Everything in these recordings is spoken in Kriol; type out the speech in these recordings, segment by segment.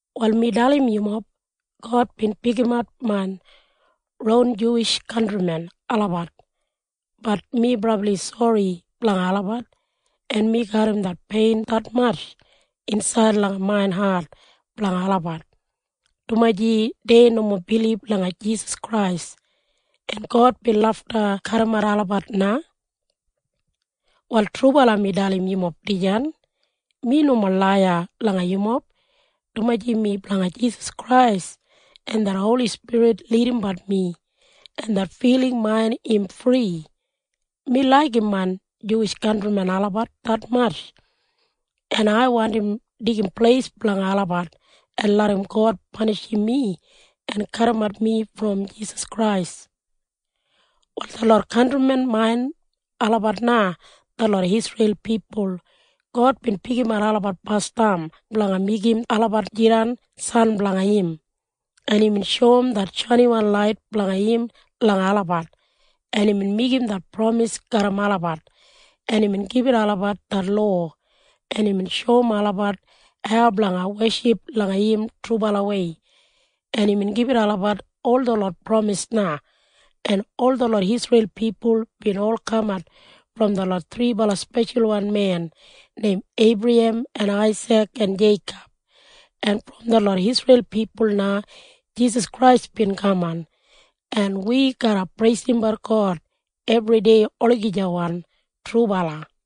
Wal mi dalim yumob. God bin pikimat main ron Juwish kantrimen olabat. Bat mi brabli sori blanga olabat, en mi garram det pein detmatj insaid langa main hat blanga olabat, dumaji dei nomo bilib langa Jisas Krais, en God bin lafta kadimat olabat na. Wal trubala mi dalim yumob dijan. Mi nomo laiya langa yumob, dumaji mi blanga Jisas Krais, en det Holi Spirit lidimbat mi, en det filing main im fri. Mi laigim main Juwish kantrimen olabat detmatj, en ai wandim deigim pleis blanga olabat en larram God panishim mi en kadimat mi brom Jisas Krais. Wal detlot kantrimen main olabat na detlot Isreil pipul. God bin pikimat olabat basdam blanga meigim olabat jidan biginini blanga im, en imbin shoum det shainiwan lait blanga im langa olabat, en imbin meigim det pramis garram olabat, en imbin gibit olabat det lowa, en imbin shoum olabat hau blanga weship langa im trubalawei, en imbin gibit olabat ol detlot pramis na, en ol detlot Isreil pipul bin ol kamat brom detlot thribala speshalwan men neim Eibrahem en Aisik en Jeikob, en brom detlot Isreil pipul na Jisas Krais bin kaman. En wi garra preisimbat God ebridei olagijawan. Trubala.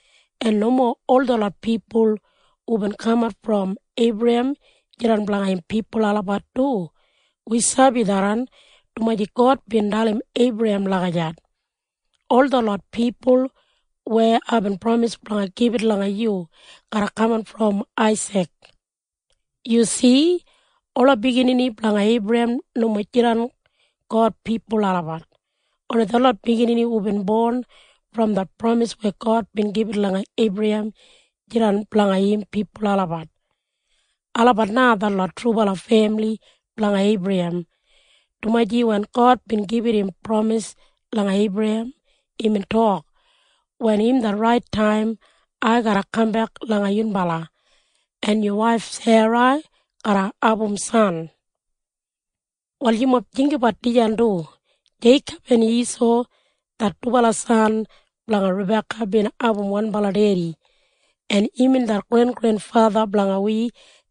En nomo ol detlot pipul hubin kamat brom Eibrahem jidan blanga im pipul olabat du. Wi sabi tharran dumaji God bin dalim Eibrahem lagijat, “Ol detlot pipul weya aibin pramis blanga gibit langa yu garra kaman brom Aisik.” Yu si? Ola biginini blanga Eibrahem nomo jidan God pipul olabat. Oni detlot biginini hubin bon brom det pramis weya God bin gibit langa Eibrahem jidan blanga im pipul olabat. Olabat na detlot trubala femili blanga Eibrahem, dumaji wen God bin gibit im pramis langa Eibrahem, imbin tok, “Wen im det rait taim, ai garra kambek langa yunbala, en yu waif Sera garra abum san.” Wal yumob jinggabat dijan du. Jeikob en Isau det dubala san blanga Rabeka bin abum wanbala dedi, en imbin det grengrenfatha blanga wi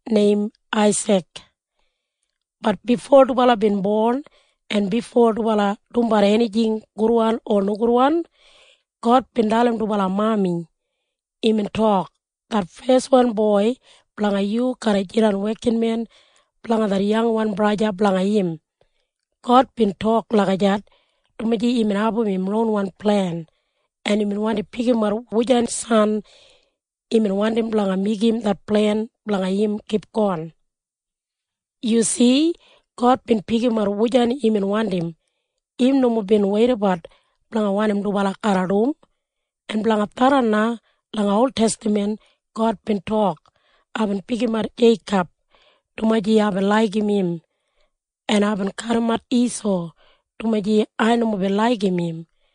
neim Aisik. Bat bifo dubala bin bon en bifo dubala dumbat enijing gudwan o nogudwan, God bin dalim dubala mami. Imbin tok, “Det feswan boi blanga yu garra jidan wekinmen blanga det yangwan braja blanga im.” God bin tok lagijat dumaji imbin abum im ronwan plen, en imbin wandi pikimat wujan san imbin wandim blanga meigim det plen blanga im kipgon. Yu si? God bin pikimat wujan imbin wandim. Im nomo bin weidabat blanga wanim dubala garra dum. En blanga tharran na langa oltestaman God bin tok, “Aibin pikimat Jeikob, dumaji aibin laigim im. En aibin kadimat Isau, dumaji ai nomo bin laigim im.”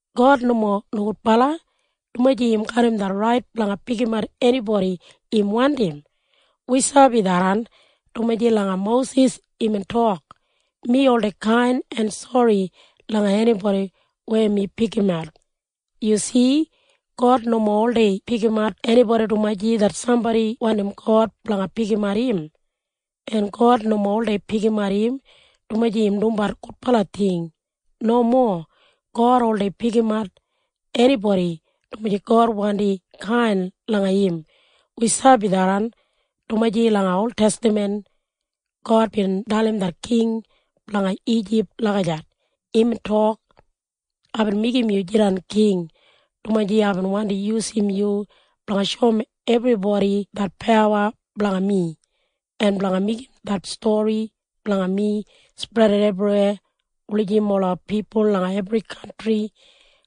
God nomo nogudbala, dumaji im garram det rait blanga pikimat enibodi im wandim. Wi sabi tharran, dumaji langa Mosis imbin tok, “Mi oldei kain en sori langa enibodi weya mi pikimat.” Yu si? God nomo oldei pikimat enibodi dumaji det sambodi wandim God blanga pikimat im. En God nomo oldei pikimat im dumaji im dumbat gudbala ting. Nomo. God oldei pikimat enibodi dumaji God wandi kain langa im. Wi sabi tharran, dumaji langa oltestaman God bin dalim det king blanga Ijip lagijat. Imbin tok, “Aibin meigim yu jidan king, dumaji aibin wandi yusum yu blanga shoum ebribodi det pawa blanga mi, en blanga meigim det stori blanga mi spredat ebriweya, wulijim ola pipul langa ebri kantri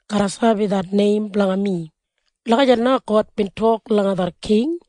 garra sabi det neim blanga mi.” Lagijat na God bin tok langa det king.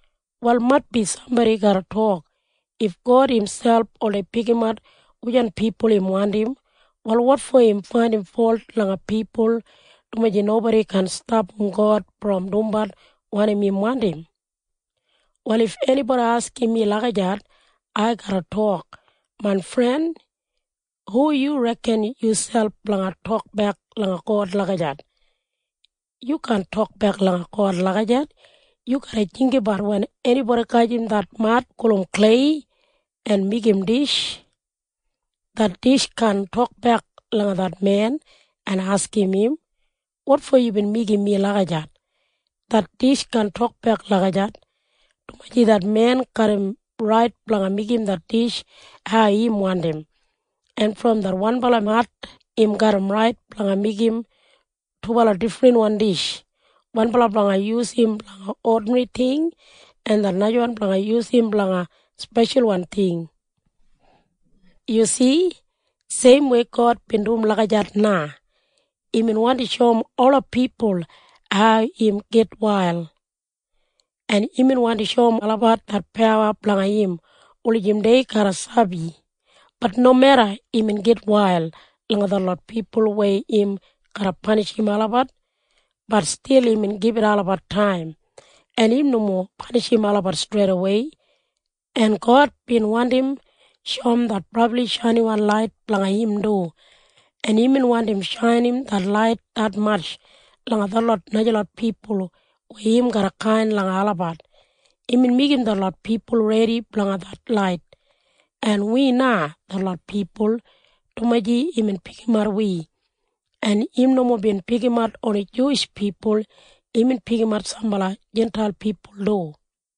Wal maitbi sambodi garra tok, “If God imselp oldei pikimat wujan pipul im wandim, wal wotfo im faindim folt langa pipul dumaji nobodi kaan stapam God brom dumbat wanim im wandim?” Wal if enibodi askim mi lagijat, ai garra tok, “Main fren, hu yu reken yuselp blanga tokbek langa God lagijat? Yu kaan tokbek langa God lagijat. Yu garra jinggabat wen enibodi gajim det mad gulum klei en meigim dish, det dish kaan tokbek langa det men en askim im, ‘Wotfo yubin meigim mi lagijat?’ Det dish kaan tokbek lagijat, dumaji det men garram rait blanga meigim det dish hau im wandim. En brom det wanbala mad im garram rait blanga meigim dubala difrinwan dish, wanbala blanga yusum blanga odinri ting en det najawan blanga yusum blanga speshalwan ting.” Yu si? Seimwei God bin dum lagijat na. Imbin wandim shoum ola pipul hau im gitwail, en imbin wandi shoum olabat det pawa blanga im wulijim dei garra sabi. Bat nomeda imbin gitwail langa detlot pipul weya im garra panishim olabat, bat stil imbin gibit olabat taim, en im nomo panishim olabat streidawei. En God bin wandim shoum det brabli shainiwan lait blanga im du, en imbin wandim shainim det lait detmatj langa detlot najalot pipul weya im garra kain langa olabat. Imbin meigim detlot pipul redi blanga det lait, en wi na detlot pipul, dumaji imbin pikimat wi. En im nomo bin pikimat oni Juwish pipul. Imbin pikimat sambala Jintail pipul du.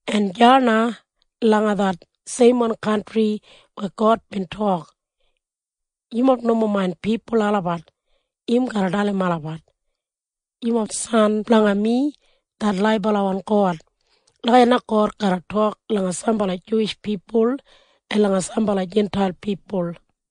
En deya na langa det seimwan kantri weya God bin tok, “Yumob nomo main pipul olabat,” im garra dalim olabat, “Yumob biginini blanga mi, det laibalawan God.” Lagijat na God garra tok langa sambala Juwish pipul en langa sambala Jintail pipul.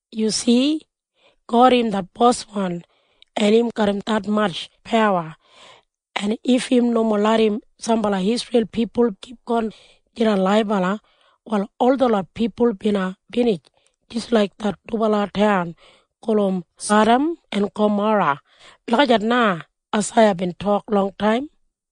Yu si? “God im det Boswan, en im garram detmatj pawa, en if im nomo larram sambala Isreil pipul kipgon jidan laibala, wal ol detlot pipul bina binij jis laik det dubala taun gulum Sadam en Gamora.” Lagijat na Aisaiya bin tok longtaim.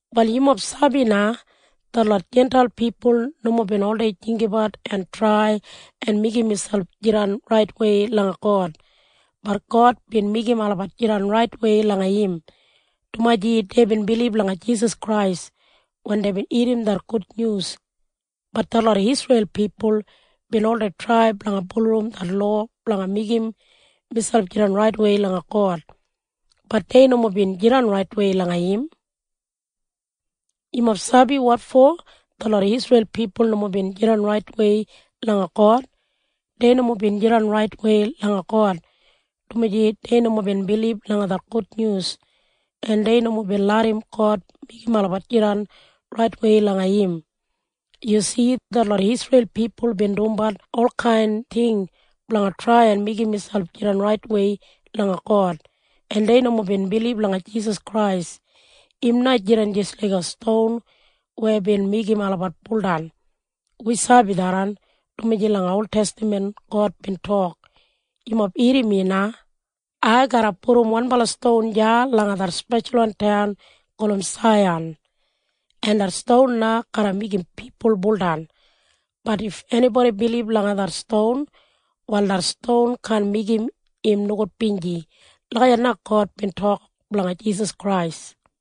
Wal yumob sabi na? Detlot Jintail pipul nomo bin oldei jinggabat en trai en meigim miselp jidan raitwei langa God. Bat God bin meigim olabat jidan raitwei langa im, dumaji deibin bilib langa Jisas Krais wen deibin irrim det gudnyus. Bat detlot Isreil pipul bin oldei trai blanga bulurrum det lowa blanga meigim miselp jidan raitwei langa God. Bat dei nomo bin jidan raitwei langa im. Yumob sabi wotfo detlot Isreil pipul nomo bin jidan raitwei langa God? Dei nomo bin jidan raitwei langa God, dumaji dei nomo bin bilib langa det gudnyus, en dei nomo bin larram God meigim olabat jidan raitwei langa im. Yu si? Detlot Isreil pipul bin dumbat olkain ting blanga trai en meigim miselp jidan raitwei langa God, en dei nomo bin bilib langa Jisas Krais. Im na jidan jis laiga ston weya bin meigim olabat buldan. Wi sabi tharran, dumaji langa oltestaman God bin tok, “Yumob irrim mi na. Ai garra pudum wanbala ston deya langa det speshalwan taun gulum Saiyan. En det ston na garra meigim pipul buldan. Bat if enibodi bilib langa det ston, wal det ston kaan meigim im nogudbinji.” Lagijat na God bin tok blanga Jisas Krais.